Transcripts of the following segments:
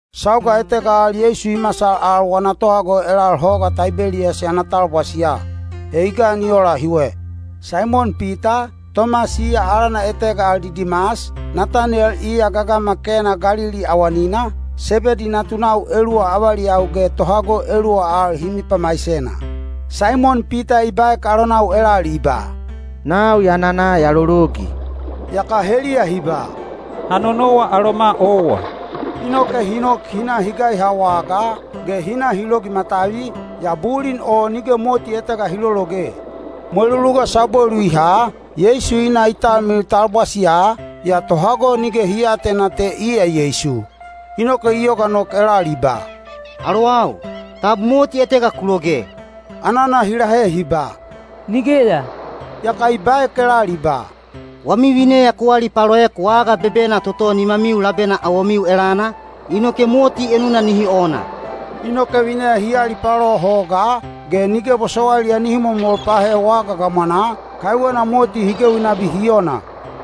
Sauga etega al Yeisu i masal al wana tohago elal Hoga Taibeliyas ana talbwasiya. He i gan i ola hiwe. Saimon Pita, Tomas (iya alana etega al Didimas), Nataniyel (iya gagama Kena Galili awanina), Sebedi natunau eluwa avaliyau ge tohago eluwa al hi mipamaisena. Saimon Pita i baek alonau elal i ba, “Nau ya nana ya lologi.” Yaka heliya hi ba, “Ha nonowa aloma owa.” Inoke hi nok hi na hi gaiha wagaa, ge hi na hi logi matavi, yaa bulin o nige moti etega hi lologe. Mweluluga sabwelu i haha, Yeisu i na i talmilil talbwasiya, yaa tohago nige hi aatena te iya Yeisu. Inoke i yoga nok elal i ba, “Alowau, tab moti etega ku loge?” Anana hi lahe hi ba, “Nigeya.” Yaka i baek elal i ba, “Wami vineya ku alipaloek waga bebena toto nimamiu labena awomiu elana, inoke moti enuna nihi ona.” Inoke vineya hi alipalo hogaa, ge nige bosowailiya nihi momol pahe waga gamwanaa, kaiwena moti hi gewi nabi hi ona.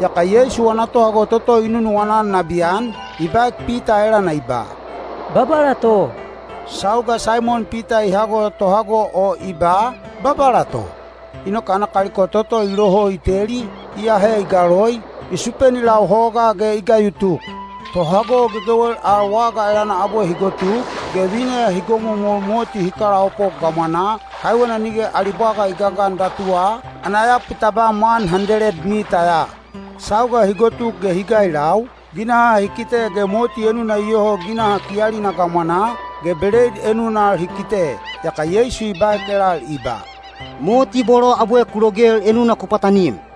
Yaka Yeisu wana tohago toto i nunuwana-an nabiyan, i baek Pita elana i ba, “Babala to!” Sauga Saimon Pita i hago tohago o i ba, “Babala to,” inoke ana kaliko toto i loho i teli, i ahe i galoi, i supeni lau hogaa ge i gayutuk. Tohago gegewel al waga elana abwe hi gotuk, ge vineya hi gomomol moti hi kalaopop gamwanaa, kaiwena nige ali bwaga i gagan datuwa, ana yapu tabam wan handeled mita ya. Sauga hi gotuk ge hi gailau, ginaha hi kite ge moti enuna iyoho ginaha kiyalina gamwanaa, ge beleid enuna al hi kite. Yaka Yeisu i baek elal i ba, “Moti bolo abwe ku logel enuna ku pwatanim.”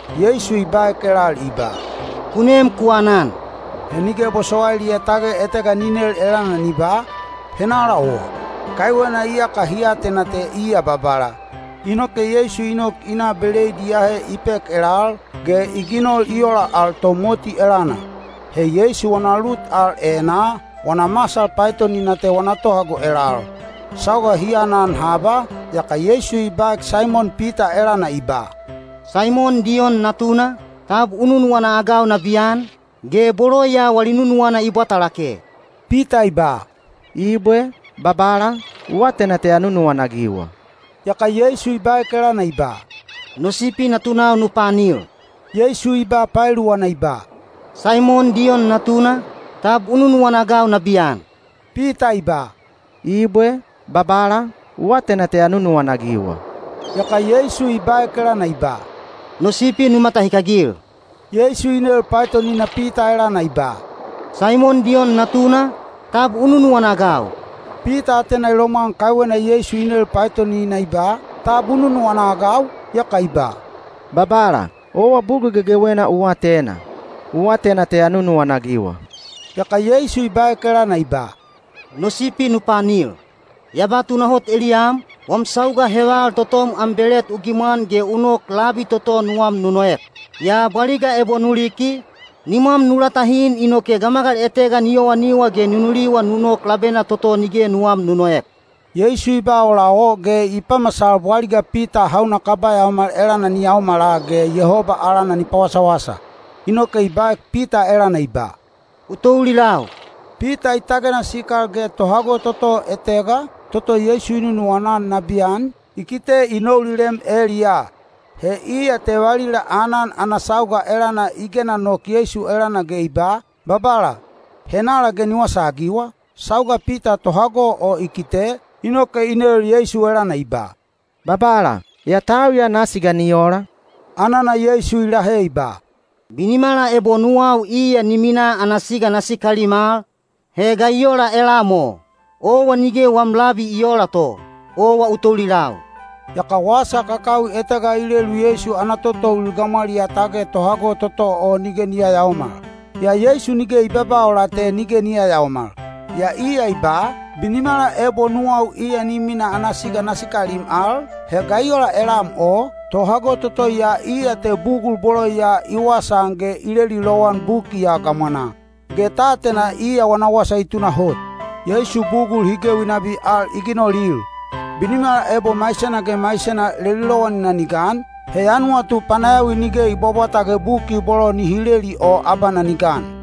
Yeisu i baek elal i ba, “Ku nem ku anan.” He nige bosowailiya tage etega ni nel elana ni ba, “Henala owa,” kaiwena iyaka hi atena te iya Babala. Inoke Yeisu i nok i na beleid i ahe i pek elal, ge i ginol i ola al to moti elana. He Yeisu wana lut al enaa, wana masal paetonina te wana tohago elal. Sauga hi anan haba, yaka Yeisu i baek Saimon Pita elana i ba, “Saimon Diyon natuna, tab u nunuwana-agau nabiyan, ge bolo ya wali nunuwana i bwata lake?” Pita i ba, “Ibwe, Babala, u atena te ya nunuwana-agiwa.” Yaka Yeisu i baek elana i ba, “No sipi natunau nu paanil.” Yeisu i ba paeluwana i ba, “Saimon Diyon natuna, tab u nunuwana-agau nabiyan?” Pita i ba, “Ibwe Babala, u atena te ya nunuwana-agiwa.” Yaka Yeisu i baek elana i ba, “No sipi nu matahikagil.” Yeisu i nel paetonina Pita elana i ba, “Saimon Diyon natuna, tab u nunuwana-agau?” Pita atena i lomwan kaiwena Yeisu i nel paetonina i ba, “Tab u nunuwana-agau?” Yaka i ba, “Babala, owa bugul gegewena u atena. U atena te ya nunuwana-agiwa.” Yaka Yeisu i baek elana i ba, “No sipi nu paanil. Ya ba tunahot eliyam, wam sauga heval totom am belet u gimwan ge u nok labi toto nuwam nu noek. Yaa bwaliga ebo nu liki, nimwam nu latahin inoke gamagal etega ni yowaniwa ge ni nuliwa nu nok labena toto nige nuwam nu noek.” Yeisu i ba ola o ge i pamasal bwaliga Pita hauna kaba yaomal elana ni yaomala ge Yehoba alana ni pawasawasa. Inoke i baek Pita elana i ba, “U toulilau!” Pita i tagena sikal ge tohago toto etega, toto Yeisu i nunuwana-an nabiyan, i kite i noulilem eliyaa. (He iya te valila aanan ana sauga elana i gena nok Yeisu elana ge i ba, “Babala, henala ge ni wasaagiwa?”) Sauga Pita tohago o i kite, inoke i nel Yeisu elana i ba, “Babala, yaa tau ya nasi ga ni ola?” Anana Yeisu i lahe i ba, “Binimala ebo nuwau iya ni mina ana siga na sikalim al, he ga i ola elam o? Owa nige wam labi i oola to. Owa u toulilau.” Yaka wasa kakawi etega i lelu Yeisu ana tototoulil gamwaliyaa tage tohago toto o nige ni yayaomal. Yaa Yeisu nige i babaa ola te nige ni yayaomal. Yaa iya i ba, “Binimala ebo nuwau iya ni mina ana siga na sikalim al, he ga i ola elam o?” Tohago toto ya iya te bugul bolo ya i wasaan ge i leli lowan buki ya gamwanaa. Ge ta atena iya wana wasa i tunahot. Yeisu bugul hi gewi nabi al i ginolil. Binimala ebo maisena ge maisena leli lowanina ni gan, he ya nuwatu panayawi nige i bwabwata ge buki bolo nihi leli o abana ni gan.